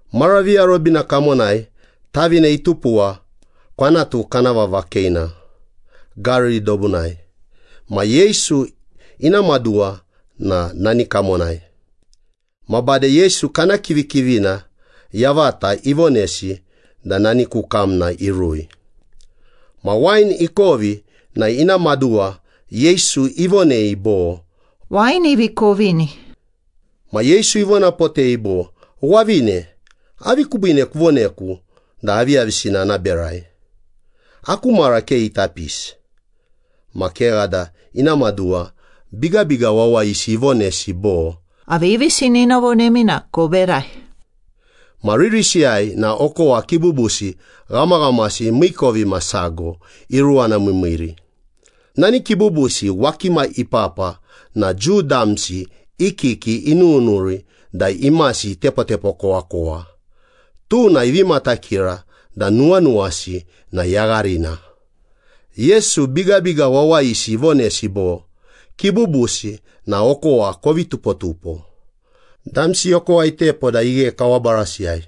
Mara viarobina kamonai tavine itupuwa kwanatu kana vava Keina, Gariri dobunai. Ma Yesu ina maduwa na nani kamonai. Ma bade Yesu kana kivikivina yavata ivonesi da nani ku kamna irui. Ma wain ikovi na ina maduwa Yesu ivonei bo, “Wain ivi kovini.” Ma Yesu ivonapotei bo, “Wavine, avi kubiine kuvoneku da aviyavisina ana berai. Aku mara ke ita pisi.” Ma kegha da ina maduwa bigabiga wawayisi ivonesi bo, “Aviyavisina ina vonemi na koberai.” Ma ririsiyai na okowa kibubusi ghamaghamasi miikovimasago iruwanamiimiiri. Nani kibubusi wakimiyai ipapa na Jiu damsi i kiki inununuri da imasi itepotepokowakowa, tuna ivi matakira da nuwanuwasi na yagharina. Yesu bigabiga wawayisi ivonesi bo, “Kibubusi na okowa kovi tupotupo.” Damsi okowa itepo da ighe kawa barasiyai.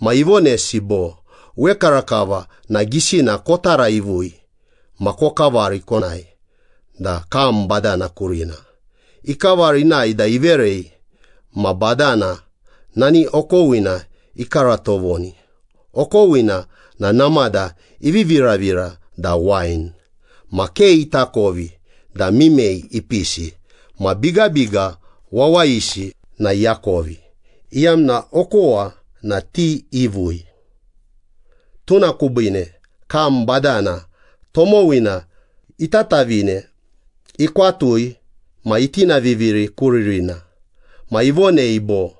Ma ivonesi bo, “Wekarakava na gisina kotaraivui ma kokavari konae da kam badana kurina.” Ikavari inae da iverei, ma badana nani okowina ikaratovoni. Okowina na namada ivi viravira da wain. Ma ke itakovi da mimei ipisi ma bigabiga wawayisi na iakovi, iyamna okowa na ti ivui. Tuna kubiine kam badana tomowina itatavine ikwatui ma itinaviviri ku ririna. Ma ivonei bo,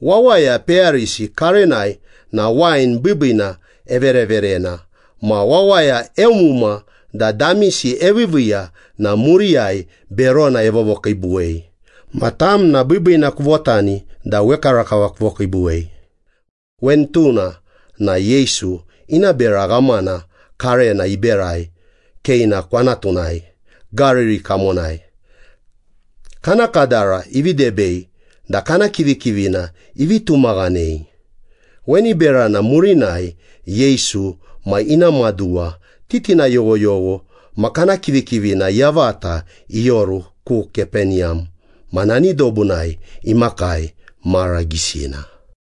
“Wawaya peyarisi karenai na wain biibiina evereverena ma wawaya eumuma da damisi eviiviiya ma muriyai berona evovokiibuwei. Ma tam na biibiina kuvotani da wekarakava kuvokiibuwei.” Weni tuna na Yesu ina bera ghamana karena iberai Keina kwanatunai, Gariri kamonai. Kana kadara ivi debei da kana kivikivina ivi tumaghanei. Weni berana murinai Yesu ma ina maduwa, titina yoghyogho ma kana kivikivina yavata ioru ku Kapeniyam. Ma nani dobunai imakii mara gisina.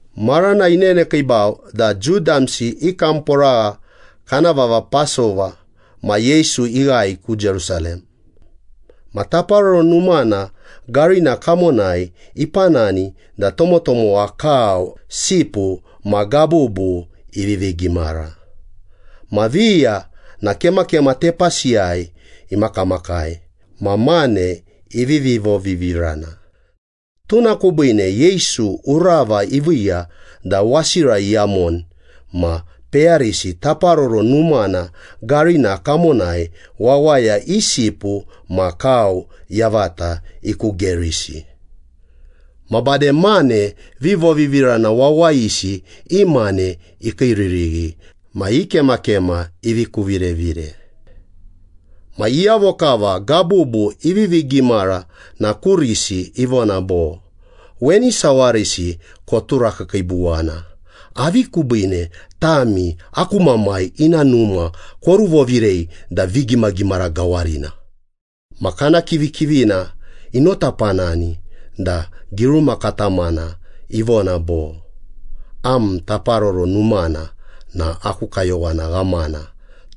Marana inenekiibau da Jiu damsi i kamporagha kana vava Pasova ma Yesu ighae ku Jerusalem. Ma Taparoro Numana garina kamonai ipanani da tomotomowa kau, sipu ma gabubu ivivi gimara. Ma viya na kemakema tepasiyai imakamakai ma mane ivivi vovivirana. Tuna kubiine Yesu urava iviiya da wasira iyamoni ma peyarisi Taparoro Numana garina kamonai wawaya i sipu ma kau yavata ikugerisi. Ma bade mane vivovivirana wawayisi i mane ikiiririghi ma i kemakema ivi kuvirevire. Ma iyavo kava gabubu ivivi gimara na kurisi ivona bo, “Weni sawarisi koturakiikiibuwana. Avi kubiine tami aku Mamai ina Numa koruvovirei da vigimagimara gawarina?” Ma kana kivikivina inotapanani da giruma katamana ivona bo, “Am Taparoro Numana na aku kayowana ghamana,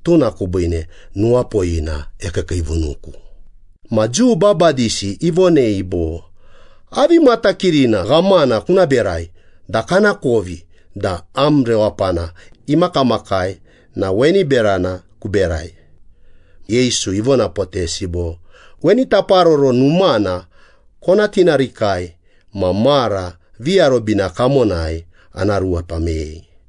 tuna kubiine nuwapoyina ekiikiivunuku.” Ma Jiu babadisi ivonei bo, “Avi matakirina ghamana kuna berai da kanakovi da am rewapana imakamakai na weni berana kuberai?” Yesu ivonapotesi bo, “Weni Taparoro Numana kona tinarikai ma mara viarobina kamonai ana ruepa meyei.”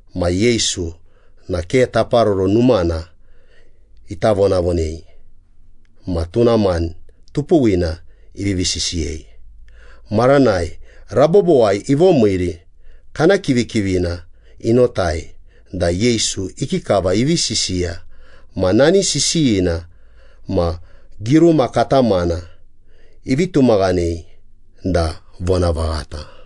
Ma Yesu na ke Taparoro Numana ita vonavonei ma tuna mani tupuwina ivivi sisiyei. Maranai rabobowai ivomiiri, kana kivikivina inotai da Yesu ikikava ivi sisiya. Ma nani sisiyina ma giruma katamana ivi tumaghanei da vonavaghata.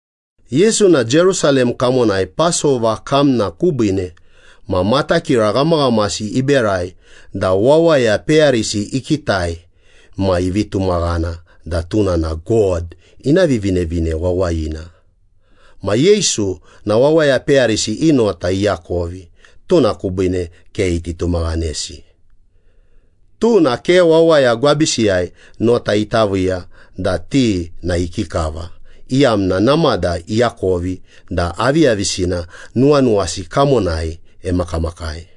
Yesu na Jerusalem kamonai Pasova kamna kubiine, ma matakira ghamaghamasi iberai da wawaya peyarisi ikitai ma ivi tumaghana da tuna na God ina Vivinevine Wawayina. Ma Yesu na wawaya peyarisi i nota iakovi, tuna kubiine ke iti tumaghanesi. Tuna ke wawaya gwabisiyai nota ita viiya da ti na ikikava, iyamna namada iakovi da aviyavisina nuwanuwasi kamonai emakamakai.